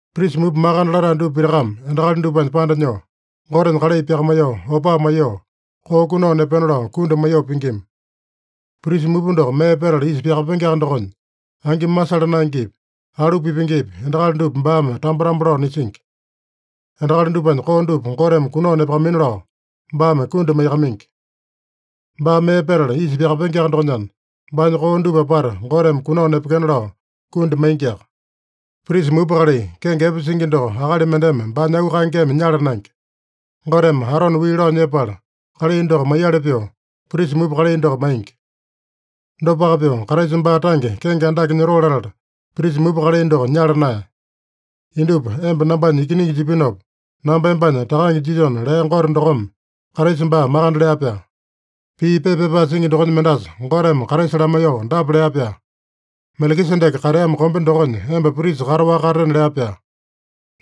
Prisa mupa makande latae dupa pitakame endakali dupanya panda nyoo, Gotenya kalai pyakamaiyoo, opaa maiyoo, koo kunao nepena lao kundi maiyoo pingima. Prisa mupa doko mee petala isa pyakapengeaka dokonya, angi masala naengepi, alu pipengepi endakali dupa baame tambo-tambo lao nisingi. Endakali dupanya koo dupa Goteme kunao nepakamaina lao baame kundi maiyakamaingi. Baa mee petala isa pyakapengeaka dokonyana, baanya koo dupa apata Goteme kunao nepekena lao kundi maingiaka. Prisa mupa kalai, kenge epe singi doko akali mendeme baanya auu kaengeme nyala naenge. Goteme Arone wii lao nyepala kalai doko maiyali pyoo, prisa mupa kalai doko maingi. Dopaka pyoo Kraisa baa tange kenge andake nyotoo latala, prisa mupa kalai doko nyala naeya. “Indupa emba nambanya Ikiningi jipinopa, namba embanya Takange jilyona” lea Gote dokome, Kraisa baa makande lea-pyaa. Pii pepa pyapae singi dokonya mendasa Goteme Kraisa lamaiyoo dapa lea-pyaa: “Melekisedeke kateamo kombe dokonya emba prisa kataowaka katatena” lea-pyaa.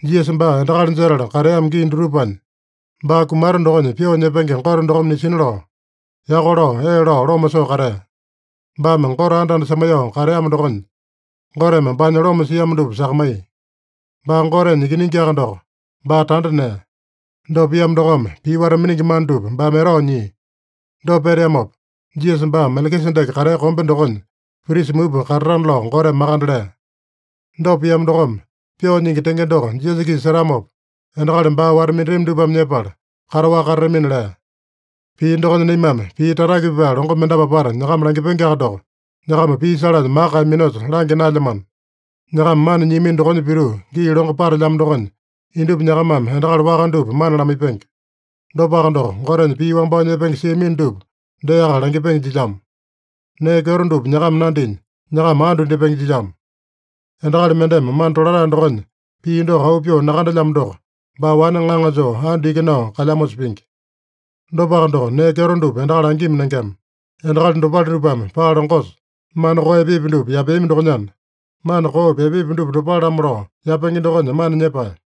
Jisasa baa endakali jetala kateamo gii dutupanya, baa kumata dokonya pyoo nyepenge Gote dokome nisina lao, yako lao ee lao loma soo katea. Baame Gote anda-anda semaiyoo kateamo dokonya, Goteme baanya loma siamo dupa sakamaiya. Baa Gotenya Ikiningiaka doko, baa tanda nea. Dopa piamo dokome, pii wata-miningi mana dupa baame etao nyia. Dopa peteamopa, Jisasa baa Melekisedeke katea kombe dokonya prisa mupa katatana lao Goteme makande lea. Dopa piamo dokome, pyoo nyingi tenge doko Jisasa-kisa setamopa, endakali baa wata-minatami dupame nyepala, kataowaka katatamina lea. Pii dokonya naimame pii tatake pipae longo mendapu apata nyakama langipengeaka doko, nyakama pii salanya maka kaeyaminosa langya naelyamano. Nyakama mana nyiamino dokonya pituu, gii longo patelyamo dokonya, indupa nyakamame endakali waka dupa mana lamaipenge. Dopaka doko, Gotenya pii wambao nyepenge siamino dupa deaka langipenge jilyamo. Nee kyeto dupa nyakama nandinya, nyakama andu dipenge jilyamo. Endakali mendeme mana tolatae dokonya pii doko auu pyoo nakandelyamo doko, baa wane ŋaŋa joo andu iki nao kalyamosa pingi. Dopaka doko, nee kyeto dupa endakali angimi nengema. Endakali dopale dupame paa longosa mana koo epepi dupa yapeami dokonyana, mana koopi epepi dupa dopale-lamo lao yapenge dokonya mana nyepae.